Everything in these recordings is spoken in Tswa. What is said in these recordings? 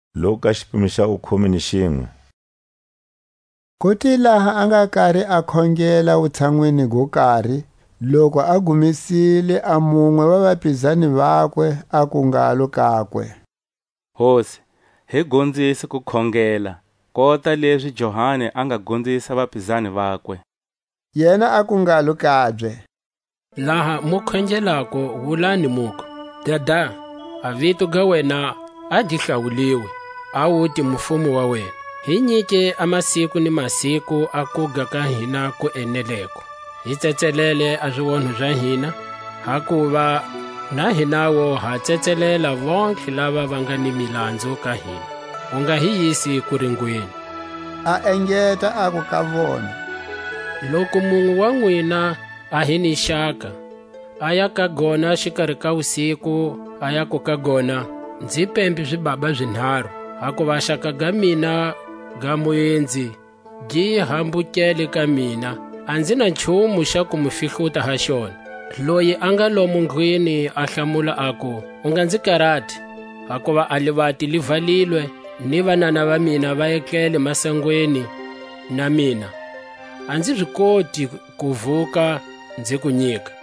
Jesu a gonzisa hi kukhongela. Ku te laha a nga kari a khongela wutshanwini go kari, loku a gumesile a munwe wa vapizani vakwe aku ngalo kakwe: Hosi, hi gonzise ku khongela, kota lezi Johani a nga gonzisa vapizani vakwe. Yena aku ngalo kabye: Laha mu khongelako wulani, muku: Dada, a vito ga wena a gi hlawuliwe; a wute mufumo wa wena. Hi nyike a masiku ni masiku a kuga ka hina ku eneleko. Hi tsetselele a zionho za hina; hakuva na hinawu ha tsetselela vontlhelele lava va aga ni milanzu ka hina. U nga hi yisi kuringweni. A engeta aku ka vona: Loku munwe wa nwina a hi ni xaka, aya ka gona xikari ka wusiku, a yaku ka gona: Nzi pembe zibaba zinharu; hakuva a xaka ga mina ga muenzi gi hambukele ka mina, a nzi na nchumu xa ku mu fihluta ha xona. Loyi a nga lomo ndlwini a hlamula, aku: U nga nzi karati; hakuva a livati li valilwe, ni vanana va mina va etlele masangweni na mina; a nzi zi koti ku vuka nzi ku nyika.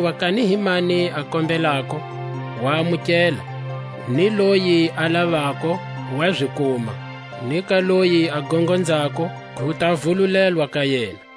Hakuva kani hi mani a kombelako, wa amukela; ni loyi a lavako, wa zi kuma; ni ka loyi a gongonzako, ku ta vululelwa ka yena.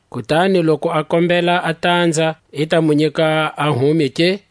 Kutani loku a kombela a tanza, i ta mu nyika a hume ke?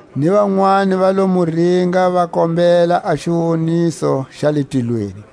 Ni vanwani va lo mu ringa, va kombela a xiwoniso xa le tilweni.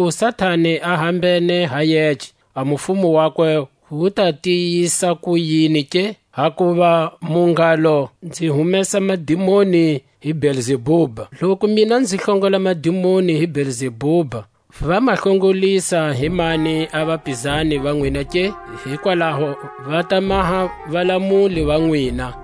Loku Satani a hambene ha yece, a mufumo wakwe wu ta tiyisa kuyini ke? Hakuva mu ngalo nzi humesa madimoni hi Belzebuba. Loku mina nzi hlongola madimoni hi Belzebuba, va ma hlongolisa hi mani a vapizani va nwina ke? Hikwalaho va ta maha valamuli va nwina.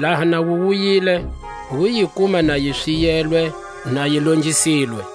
Laha na wu wuyile, wu yi kuma na yi swiyelwe na yi longisilwe.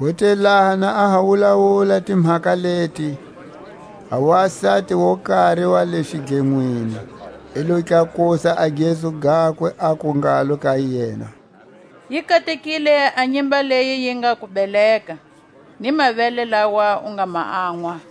Ku te laha na a ha wulawula timhaka leti, a wasati wo kari wa le xidlenwini i lo tlakusa gezu gakwe, aku ngalo ka yena: Yi katekile a nyimba leyi yi nga ku beleka, ni mavele lawa u nga ma anʼwa.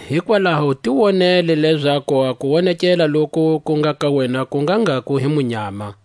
Hikwalaho ti wonele lezaku a kuwonekela loku ku nga ka wena ku nga ngha ku hi munyama.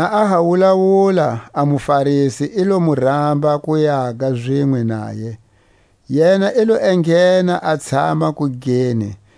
Na a ha wulawula, a muFarisi i lo mu ramba ku yaga zinwe naye; yena i lo enghena a tshama kugeni.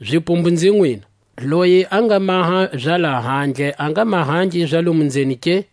Zipumbu nzi nwina, loyi a nga maha za lahandle, a nga mahangi za lomo nzeni ke?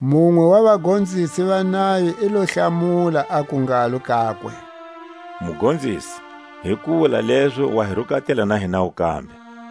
Munwe wa vagonzisi va nayo i lo hlamula aku ngalo kakwe: Mugonzisi, hi ku wula lezo wa hi rukatela na hinawu kambe,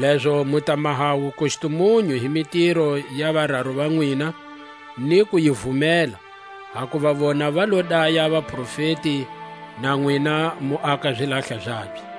Lezo mu maha wukustumunyu hi mitiro ya vararu va nwina ni ku yi vumela; hakuva vona va lo daya vaprofeti, na nwina mu aka zilahla zabye.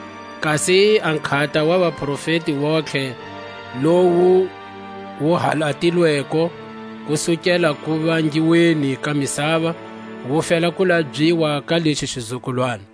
kasi a nkhata wa vaprofeti vontlhe, lowu wu halatilweko kusukela kuvangiweni ka misava, wu fela ku labyiwa ka lexi xizukulwana.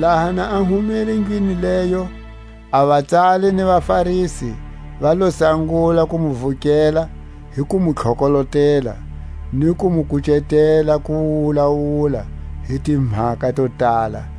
Laha na a humile ndlwini leyo, a vatsali ni vaFarisi va lo sangula ku mu vukela hi ku mu tlokolotela, ni ku mu kucetela ku wulawula hi timhaka to tala;